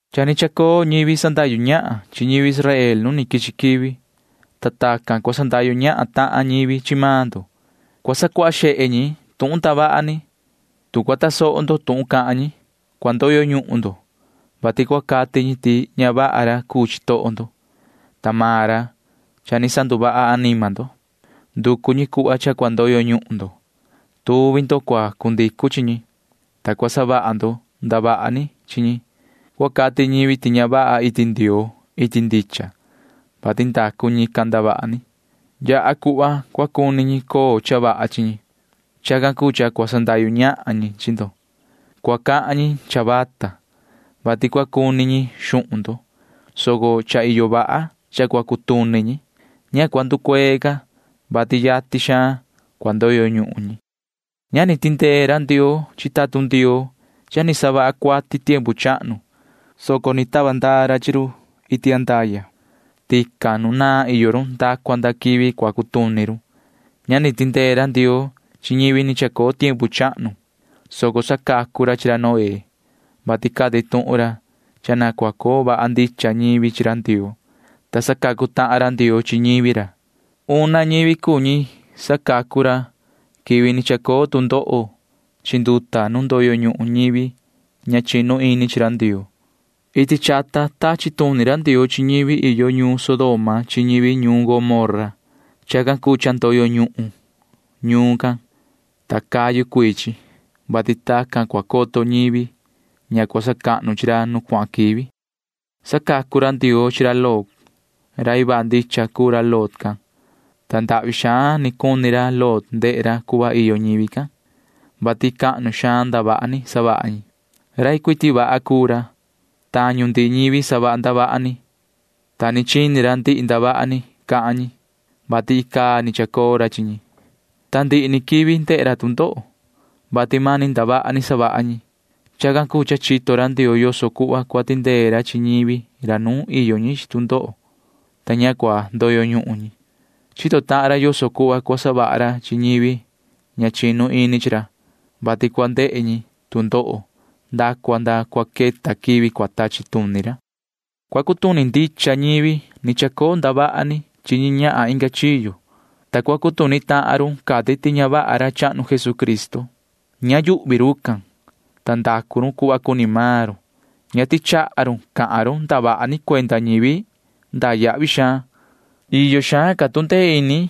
Cha ni chacoo ñivi sandahyu ñahan chi ñivi Israel nu ni quichi quivi, ta ta ni cuhva cua cuni sandahyu ñahan ñivi chi maan ndo. Cua sacuaha xehe ñi tuhun ndavaha ni. Tu cua tasoho ndo tuhun cahan ñi, cua ndoyo ñuhun ndo, vati cua cati ñi ti ña vaha ra cuu chitoho ndo, ta maan ra cuu ra sanduvaha anima ndo. Nducu maan ñi cha cua ndoyo ñuhun yatin ñi. Tuvi ndo cua cundicu chi ñi, ta cua savaha ndo ndavaha ni chi ñi. Cua cati ñivi ti ña vaha iti Ndioo iti ndicha, vati ndacu ñican ndavaha ni. Cua yaha cuhva cha cua cuni ñi coo cha vaha chi ñi. Chacan cuu cha cua sandahyu ñahan ñi chi ndo. Cua cahan vata ñi, vati cua cuni ñi xuhun ndo, soco cha iyo vaha cha cua cutuni ñi. Ña cua nducuee ca, vati yatin cua ndoyo ñuhun ñi. Ña ni tindee ra Ndioo chi tatun Ndioo cha ni savaha cuati tiempu chahnu, soco ni tava ndaa ra chi run iti andaya. Tican nu naan iyo run nda cua nda quivi cua cutuni run. Ña ni tindee ra Ndioo chi ñivi ni chacoo tiempu chahnu, soco sacacu ra chi ra Noé, vati cati tuhun ra cha na cua coo vaha ndicha ñivi chi ra Ndioo, ta sacacu tahan ra Ndioo chi ñivi ra. Una ñivi cuu ñi sacacu ra quivi ni chacoo tu ndoho chi nduta nu ndoyo ñuhun ñivi ña chinu ini chi ra Ndioo. Iti chata tachi tuni ra Ndioo chi ñivi iyo ñuun Sodoma chi ñivi ñuun Gomorra. Chacan cuu cha ndoyo ñuhun ñuun can, ta cayu cuii chi, vati chacan ni cua coto ñivi ña sacahnu chi ra nu cuahan quivi. Sacacu ra Ndioo chi ra Lot. Rai vaha ndicha cuu ra Lot can, ta ndahvi xaan cuni ra Lot ndehe ra yoso cuhva iyo ñivi can, vati cahnu xaan ndavaha ni savaha ñi. Ndehe ra vaha can ndihi ndavaha ni savaha ñi, ta chini ra ndihi ndavaha ni cahan ñi, vati icaa ni chacoo ra chi ñi, ta ndihi ni quivi ndehe ra tu ndoho, vati mani ndavaha ni savaha ñi. Chacan cuu cha chito ra Ndioo yoso cuhva cua tindee ra chi ñivi ra nuun iyo ñi chi tu ndoho, ta ña cua ndoyo ñuhun ñi. Chito tahan ra yoso cuhva cua savaha ra chi ñivi ña chinu ini chi ra, vati cua ndehe run tu ndoho nda cua nda cua queta quivi cua tachi tuni ra chi run. Cua cutuni ndicha run cha ni chacoo ndavaha ni chi ñi ñahan inga chiyo, ta cua cutuni tahan run cati ti ña vaha ra chahnu Jesucristo. Ña yuhvi rucan, ta ndacu run cuhva cuni maan run. Ña tichaha run cahan run ndavaha ni cuenda ñivi cahnu. Iyo xaan ca tu ndee ini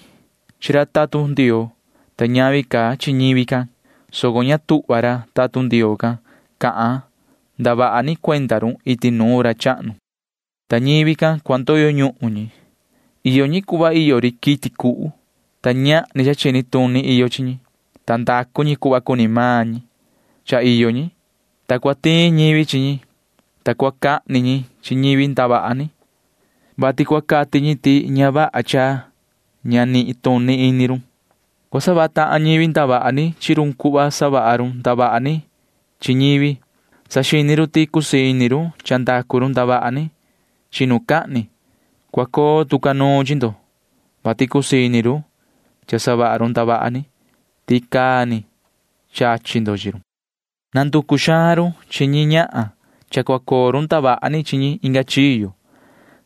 chi ra tatun Ndioo, ta iyo ca ndatu chi ra tatun ra, soco ña tuhva ra tatun Ndioo cahan ra ndavaha ni cuenda run iti nuun ra chahnu. Ta rucan cua ndoyo ñuhun run. Iyo run cuhva iyo ri quiti cuhu, ta ñahni cha chini tuni iyo chi run, ta ndacu run cuhva cuni run. Cha iyo run, ta cua tiin ñivi chi run, ta cua cahni ñi chi run, vati cua cati ñi ti ña vaha cha ña nituni ini run. Cua savaha tahan ñivi ndavaha ni chi run cuhva savaha run ndavaha ni chi ñivi. Saxini run ti cusii ini run cha ndacu run ndavaha ni chinucahni. Cua coo tu ca nuun chi ndo, vati cusii ini run savaha run ndavaha ni, ta icaa ni chachi ndo chi run. Nanducu xaan run chi ñi ñahan cha cua coo run ndavaha ni chi ñi inga chiyo.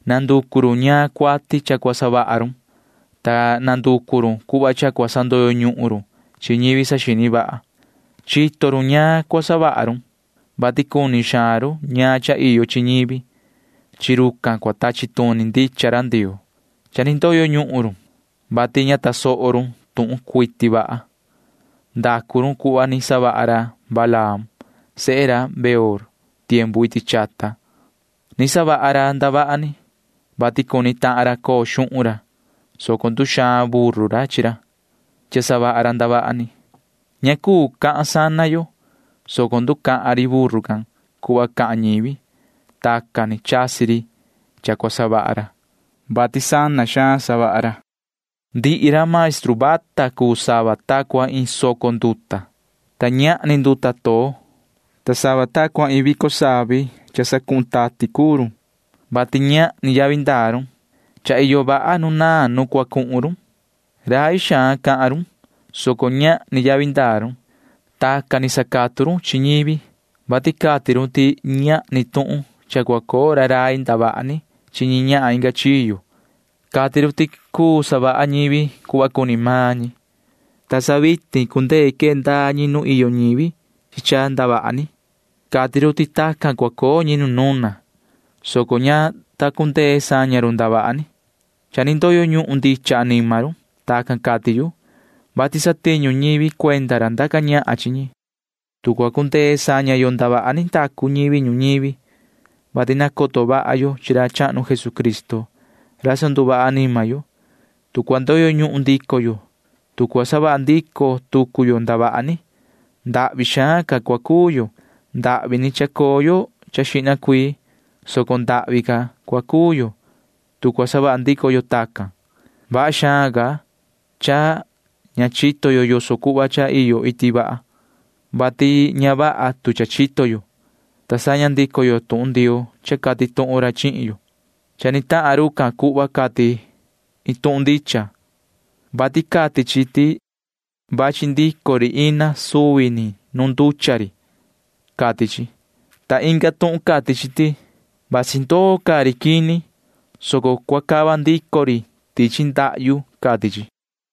Nanducu run ñaan cuati cua savaha run, ta nanducu run cuhva cha cua sandoyo ñuhun run chi ñivi saxini suhva. Chito run ñaan cua savaha run, vati cuni xaan run ñaan cha iyo chi ñivi. Chi rucan cua tachi tuni ndicha ra Ndioo. Cha ni ndoyo ñuhun run, vati ña tasoho run tuhun cuiti vaha. Ndacu run cuhva ni savaha ra Balaam sehe ra Beor iti chata tiempu chahnu. Ni savaha ra ndavaha ni, vati cuni tahan ra coo xuhun chi ra, soco nduxaan buru ra chi ra, vati savaha ra ndavaha ni. Ña cuu cahan ri sana yo, soco nducahan ri buru can cuhva cahan ñivi. Tacan ni chasi ri cha ndacu racan, vati sana xaan ndacu ra. Rucan cuu sava ta cua iin soco nduta, ta ñahni nduta too, ta sava ta cua iin vico savi cha sacuhun tati cuu run, vati ñahni yavi ndaa run. Cha iyo vaha nu naan nu cua cuhun run. Rai xaan cahan run, soco ñahni yavi ndaa run. Tacan ni sacatu run chi ñivi, vati cati run ti ñahni tuhun cha cua coo ra rai ndavaha ni chi ñi ñahan inga chiyo. Cati run ti cha cua cuu savaha ñivi cuhva cuni maan ñi, ta sa vitin cha cundee quee ndaa ñi nu iyo ñivi chi cha ndavaha ni. Cati run ti tacan cua coo ñi nu nuna, soco ña ta cundee saña run ndavaha ni. Cha ni ndoyo ñuhun ndicha anima run. Tacan cati yu, vati satiñu ñivi cuenda ra ndaca ñahan chi ñi. Tu cua cundee saña yo ndavaha ni ndacu ñivi ñuñivi, vati nacoto vaha yo chi ra chahnu Jesucristo ra sanduvaha anima yo, tu cua ndoyo ñuhun ndico yo, tu cua savaha ndico tucu yo ndavaha ni, ndahvi xaan ca cua coo yo. Ndahvi ni chacoo yo xihna cuii, soco ndahvi ca cua coo yo, tu cua savaha ndico yo tacan. Vaha xaan ca cha ña chito yo yoso cuhva cha iyo iti vaha, vati ña vaha tu cha chito yo, ta saña ndico yo tuhun Ndioo cha cati tuhun ra chihin yo. Cha ni tahan rucan cuhva cati iin tuhun ndicha, vati cati chi ti vachi ndico ri ina suvi nu nducha ri, cati chi, ta inga tuhun cati ti vasi ndoo caa ri quini, soco cua cava ndico ri tichi ndahyu, cati chi.